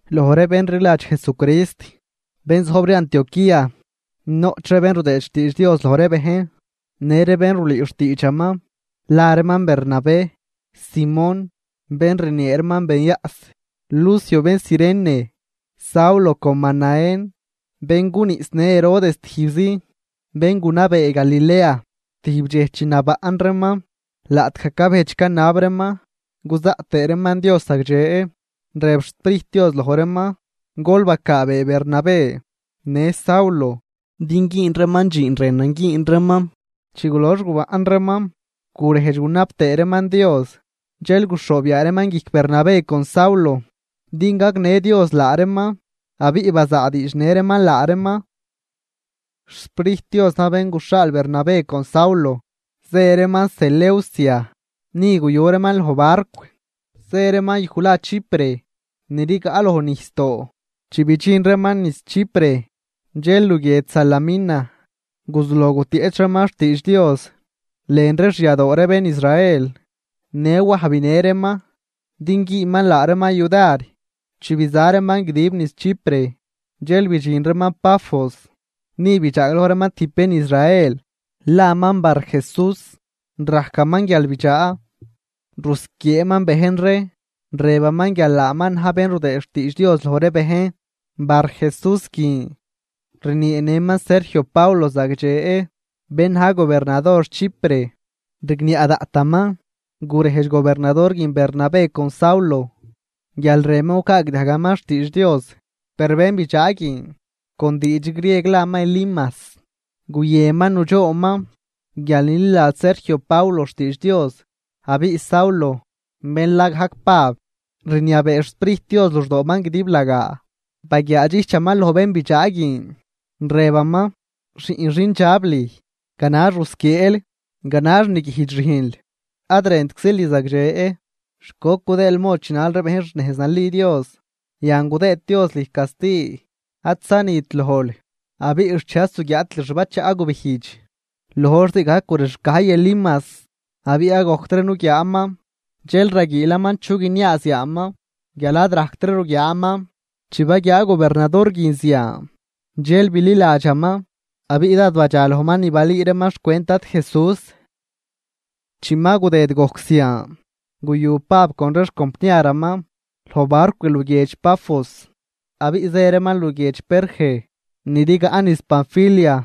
Loj ree bén rliladx Jesucrist, bén zojb ree Antioquía, noꞌch ree bén rudëëd xtiidx Dios loj ree bejn në ree bén rulüü xtiidxaman. La reeman Bernabé, Simón bén rniee reeman Benyaꞌs, Lucio bén Cirene, Saulo con Manaén bén guniꞌsnë Herodes tijbzi, bén gunabee Galilea. Tijb dxej chi nabaꞌn reeman, laꞌtgaj cabejdx canab reeman cuzaꞌt tëë reeman Dios zagdxe, rëb xSprijt Dios loj reeman: ―Gol bacaabee Bernabé në Saulo din güün reeman dxiin rënan güün reeman. Chi gulox gubaꞌn reeman gurejdx tëë reeman Dios, dxel guxhoob yaa reeman guijc Bernabé con Saulo din gagnë Dios laa reeman abiꞌ bazaadiidxnë reeman laa reeman. XSprijt Dios na̱j bén guxhaal Bernabé con Saulo, zë reeman Seleucia, ni guyu reeman loj barcw, zë reeman yuj la Chipre, ni rigaꞌ loj nijsdoo. Chi bidxin reeman niz Chipre, dxel luguiedx Salamina guzuloj gutieꞌch reeman xtiidx Dios lën ree xyadoo ree bén Israel. Në Waj binë reeman din güünman laa reeman yudar. Chi biza reeman guidib niz Chipre, dxel bidxin reeman Pafos. Ni bidxaagloj reeman tijb bén Israel laman Barjesús, rajcaman guialbidxaa, rusquieeman bejn ree, rëbaman guial laaman na̱j bén rudëëd xtiidx Dios loj ree bejn. Barjesús guin rnieenëman Sergio Paulo zagdxe, bén na̱j gobernador Chipre, rigniaꞌ daꞌtaman. Gurejdx gobernador guin Bernabé con Saulo guial rënman gucaagdiajgaman xtiidx Dios. Per bénbidxaa guin (con diidx grieg laman Elimas) guyënman nudxoonman guial nililadx Sergio Paulo xtiidx Dios. Abiꞌ Saulo, bén la gajc Pab, rniabee xSprijt Dios luxdooman guidiblagaa, baguiaadxijchaman loj bénbidxaa guin, rëbaman: ―¡Xiꞌn xindxab lüj, ganax rusquieel, ganax niguijdx rüjnl, ad rëntczil ni zagdxe! ¿Xt goc gudëël mod chinal ree bejn xnejz nali Dios? Yan gudëëd Dios lüj casti: ad zanit lojl abiꞌ xchej ad zuguiaatil xbachaꞌ gubijdx. Loj hor zii gajc gurexcajy Elimas abiꞌ ad gojctri nuguiaaman, dxel raguiilaman chu guiniaaz yaaman guial ad rajctri ruguiaaman. Chi baguiaa gobernador guin zian, dxel bililadxaman abiꞌ dád badxa lojman ni balüü reeman xcwent Dad Jesús. Chi ma gudëd gojc zian, guyu Pab con ree xcompniaraman loj barcw luguiedx Pafos abiꞌ zë reeman luguiedx Perge ni rigaꞌ niz Panfilia.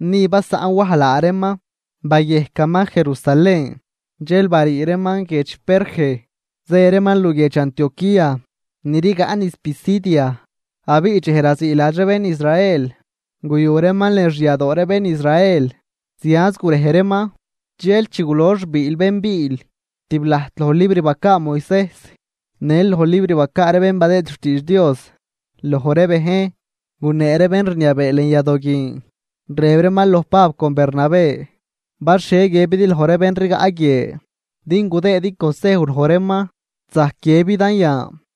Ni basaꞌn Waj laa reeman bayejcaman Jerusalén. Dxel barii reeman guiedx Perge, zë reeman luguiedx Antioquía ni rigaꞌ niz Pisidia. Abiꞌ dxej raziiladx ree bén Israel, guyu reeman lën xyadoo ree bén Israel zianz gurej reeman. Dxel chi gulox biil bén biil tib lajt loj libr bacaa Moisejs në loj libr bacaa ree bén badëë xtiidx Dios loj ree bejn, gunee ree bén rniabee lën yadoo guin, rëb reeman loj Pab con Bernabé: ―Bal xhie guiëbidi loj ree bén rigaꞌ guie din gudëëdi consejw loj reeman, zajc guiëbidan yan.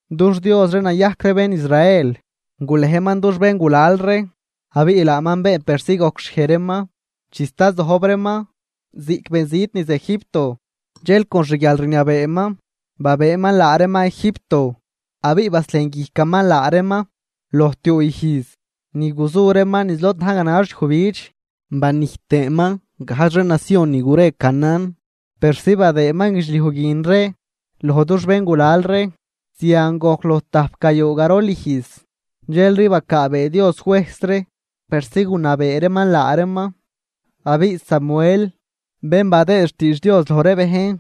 Dux Dios ree, nayajc ree bén Israel, gulejman dux béngulal ree abiꞌ laaman been persi gojcxhiej reeman, chi sta zojb reeman ziꞌc benzit niz Egipto. Dxel con xguialrniabeeman babëëman laa reeman Egipto. Abiꞌ baslejnguijcaman laa reeman loj tiuu ijz ni guzu reeman niz lod na̱j ganax yujbidx, banijt tëëman gajdx ree nacion ni gure Canaán persi badëëman guidxliuj guin ree loj dux béngulal ree. Zian gojc loj tajp gayuu garol ijz, dxelri bacaabee Dios juejs ree persi gunabee reeman laa reeman. Abiꞌ Samuel bén badëëd xtiidx Dios loj ree bejn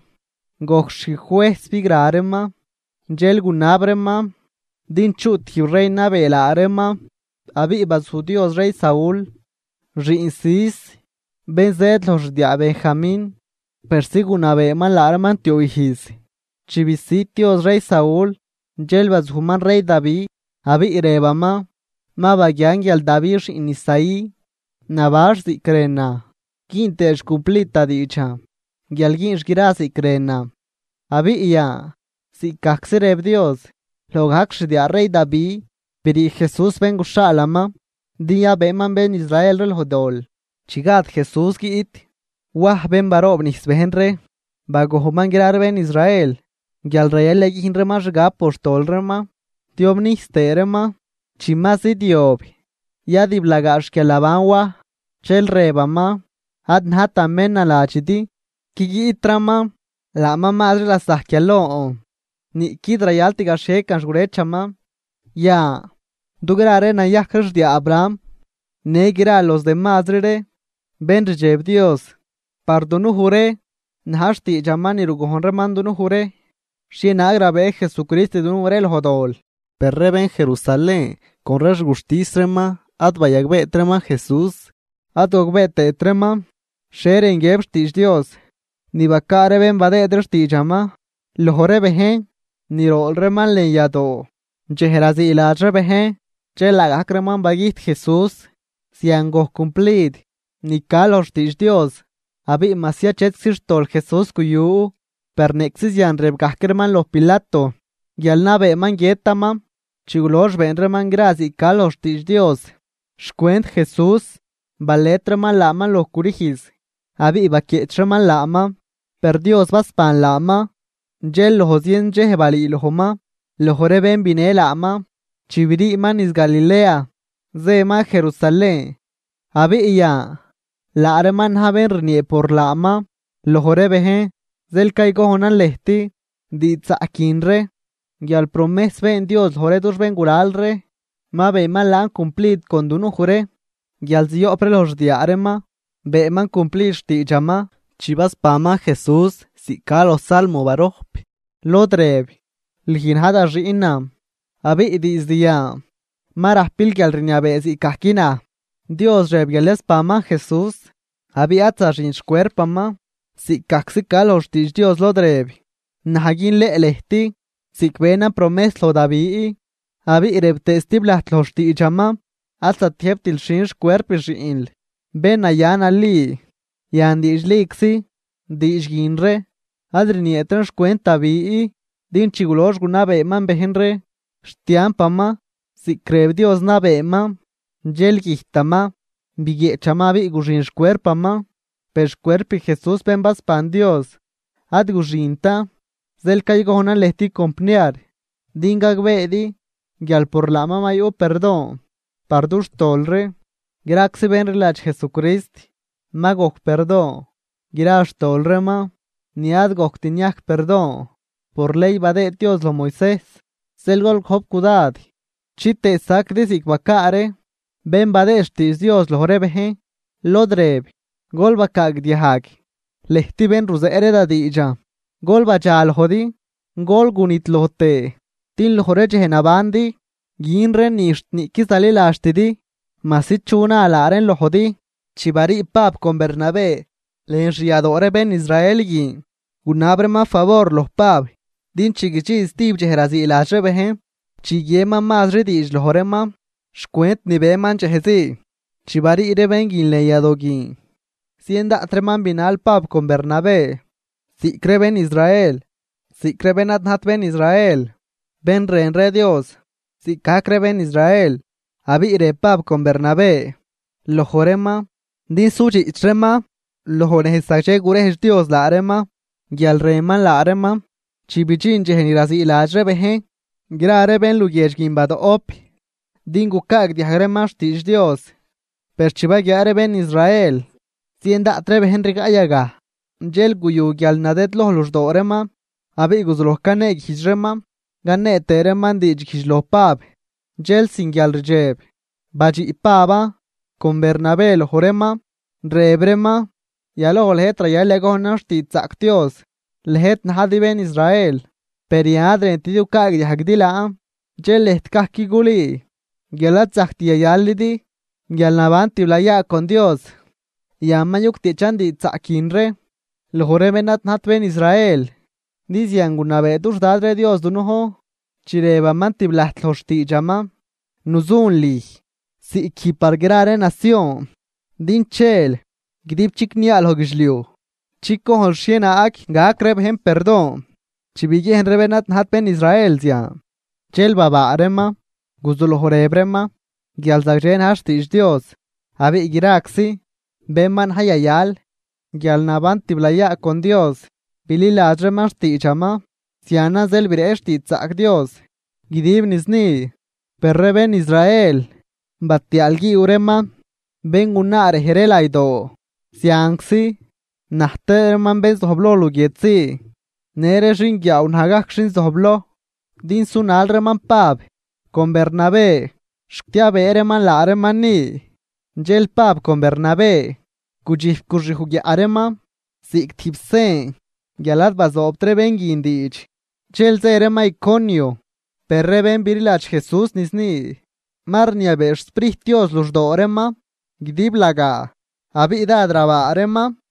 gojc xjuejs bigra reeman. Dxel gunab reeman din chuꞌ tijb rey nabee laa reeman, abiꞌ bazuj Dios rey Saúl xiꞌn Cis, bén zëëd loj xdiaa Benjamín persi gunabeeman laa reeman tiuu ijz. Chi bisüd Dios rey Saúl, dxel bazujman rey Davi. Abiꞌ rëbaman: “Ma baguian guial Davi xiꞌn Isaí, nabanx ziꞌc rënan, güün tëëx cumplid da diidxan guial güünx gra ziꞌc rënan.” Abiꞌ yan ziꞌc gajczi rëb Dios, loj gajc xdiaa rey Davi, brii Jesús bén guxhaalaman din yabëëman bén Israel ree loj dol. Chi gad Jesús guiꞌt, Waj bén baroobnijs bejn ree, bagojnman gra ree bén Israel guial rayal yayüjn reeman xgab por xtol reeman tiobnijs tëë reeman. Chi ma zidyob yadiblagaa xguialnaban Waj, dxel rëbaman: “Ad najtan bén naladxidi, qui guiꞌtraman, laaman mazri lasajc guial lon, niꞌquid rayalt gaxhiecan xgurëchaman.” ’Yan, dugra ree nayajc ree xdiaa Abraham në gra los demazri ree bén rdxeb Dios, par dunuj ree na̱j xtiidxaman ni rugojn reeman dunuj ree, xhienaag rabëë Jesucrist dunuj ree loj dol. Per ree bén Jerusalén con ree xguxtis reeman ad bayagbeet reeman Jesús. Ad gogbee tëët reeman xhie rën guiëb xtiidx Dios ni bacaa ree bén badëëd ree xtiidxaman loj ree bejn, ni rool reeman lën yadoo dxej raziiladx ree bejn, dxel laagajc reeman bagüjt Jesús, zian gojc cumplid ni ca loj xtiidx Dios. Abiꞌ majsi achetczi xtol Jesús guyu, per niꞌczi zian rëb gajc reeman loj Pilato guial nabeeman guiëtaman. Chi gulox been reeman gra ziꞌc ca loj xtiidx Dios xcwent Jesús, balet reeman laaman loj crüjz abiꞌ baquieꞌch reeman laaman. Per Dios basban laaman, dxel loj zien dxej balüülojman loj ree bén binë laaman chi briiman niz Galilea zëman Jerusalén, abiꞌ yan laa reeman na̱j bén rniee por laaman loj ree bejn. ’Zeel caygojnan lëjt diidxzaꞌc guin ree, guial promejs been Dios loj ree dux béngulal ree, ma beenman laan cumplid con dunuj ree guial zioꞌp ree loj xdiaa reeman. Beenman cumplid xtiidxaman chi basbanman Jesús ziꞌc ca loj Salmo barojp, lod rëb: “Lüj na̱j da xiꞌnan abiꞌ diizd yan ma rajpil guialrniabee ziꞌcgajc naj.” Dios rëb guial yasbanman Jesús abiꞌ ad zaxint xcuerpaman ziꞌc gajczi ca loj xtiidx Dios lod rëb: “Naj günleꞌ lëjt ziꞌc benan promejs loj Davi.” Abiꞌ rëb tëë stib lajt loj xtiidxaman: “Ad zatiëjbtil xhin xcuerp xiꞌnl, bén naya nali.” Yan diidxliczi diidx guin ree ad rnieet reen xcwent Davi, din chi gulox gunabeeman bejn ree xtiampaman ziꞌc rëb Dios nabeeman, dxel güjtaman, biguieꞌchaman abiꞌ guxin xcuerpaman. Per xcuerp Jesús bén basban Dios, ad guxintan. Zeel caygojnan lëjt compniar din gagbeedi guial por laaman ma yuꞌ perdon par dux tol ree. Graczi bén rliladx Jesucrist ma gojc perdon gra xtol reeman ni ad gojct niajc perdon por ley badëë Dios loj Moisejs. Zeel gol gojp cudad chitëë saquidi ziꞌc bacaa ree bén badëë xtiidx Dios loj ree bejn, lod rëb: Gol bacaagdiajg, lëjt bén ruzeꞌ ree da diidxan, gol badxalojdi gol gunidloj tëë. Din loj ree dxej nabandi gün reen ni xt niꞌquid zaliladxtidi, majsi chu na laa reen lojdi. Chi barii Pab con Bernabé lën xyadoo ree bén Israel guin, gunab reeman favor loj Pab, din chi guidxin stijb dxej raziiladx ree bejn chiguieman mazri diidx loj reeman xcwent ni beman dxej zii. Chi barii ree bén guin lën yado guin, zien daꞌt reeman binal Pab con Bernabé, ziꞌc ree bén Israel ziꞌc ree bén ad najt bén Israel, bén rën ree Dios ziꞌcgajc ree bén Israel. Abiꞌ rëb Pab con Bernabé loj reeman din sudxiꞌch reeman loj nejz zagdxe guredx Dios laa reeman guial rënman laa reeman. Chi bidxin dxej ni raziiladx ree bejn, gra bén luguiedx guin badoꞌp din gucaagdiajg reeman xtiidx Dios. Per chi baguiaa ree bén Israel zien daꞌt ree bejn rigaꞌ yagaj, dxel guyu guialnadëdloj luxdoo reeman abiꞌ guzuloj caneeguijdx reeman canee tëë reeman diidxguijdx loj Pab. Dxel sin guialrdxeb badxiꞌ Paban con Bernabé loj reeman, rëb reeman: ―Yaloj lëjt rayal yagojnan xtiidxzaꞌc Dios, lëjt najdi bén Israel, per yan ad rëntidi gucaagdiajguidi laan, dxel lëjt gajc culüü guial ad zajct yayalidi guialnaban tiblayaa con Dios. Yan ma yugtieꞌchan diidxzaꞌc guin ree loj ree bén ad najt bén Israel. Din zian gunabee dux Dad ree Dios dunujn, chi rëbaman tib lajt loj xtiidxaman: Nuzun lüj ziꞌc guij par gra ree nacion, din chel guidibchicniaa loj guidxliuj chicojnl xhienaag gac ree bejn perdon. Chi biguiejn ree bén ad najt bén Israel zian, dxel babaa reeman, guzuloj rëb reeman guial zagdxe na̱j xtiidx Dios, abiꞌ graczi bén ma na̱j yayal guialnaban tiblayaa con Dios, bililadx reeman xtiidxaman. Zianan zeel bireꞌch xtiidxzaꞌc Dios guidib niz ni. Per ree bén Israel batiaalguiiw reeman béngunaa rej ree laydoo zianczi na̱j tëë reeman bén zojbloj luguiedx zii, në ree xinguiaaw na̱j gajc xin zojbloj, din sunal reeman Pab con Bernabé xt yabëë reeman laa reeman ni. Dxel Pab con Bernabé gudxijp guxyuj guiaꞌ reeman ziꞌc tijb sen guial ad bazoobt ree bén guin diidx, dxel zë reeman Iconio. Per ree bén bililadx Jesús niz ni, ma rniabee xSprijt Dios luxdoo reeman guidiblagaa abiꞌ dád rabaa reeman.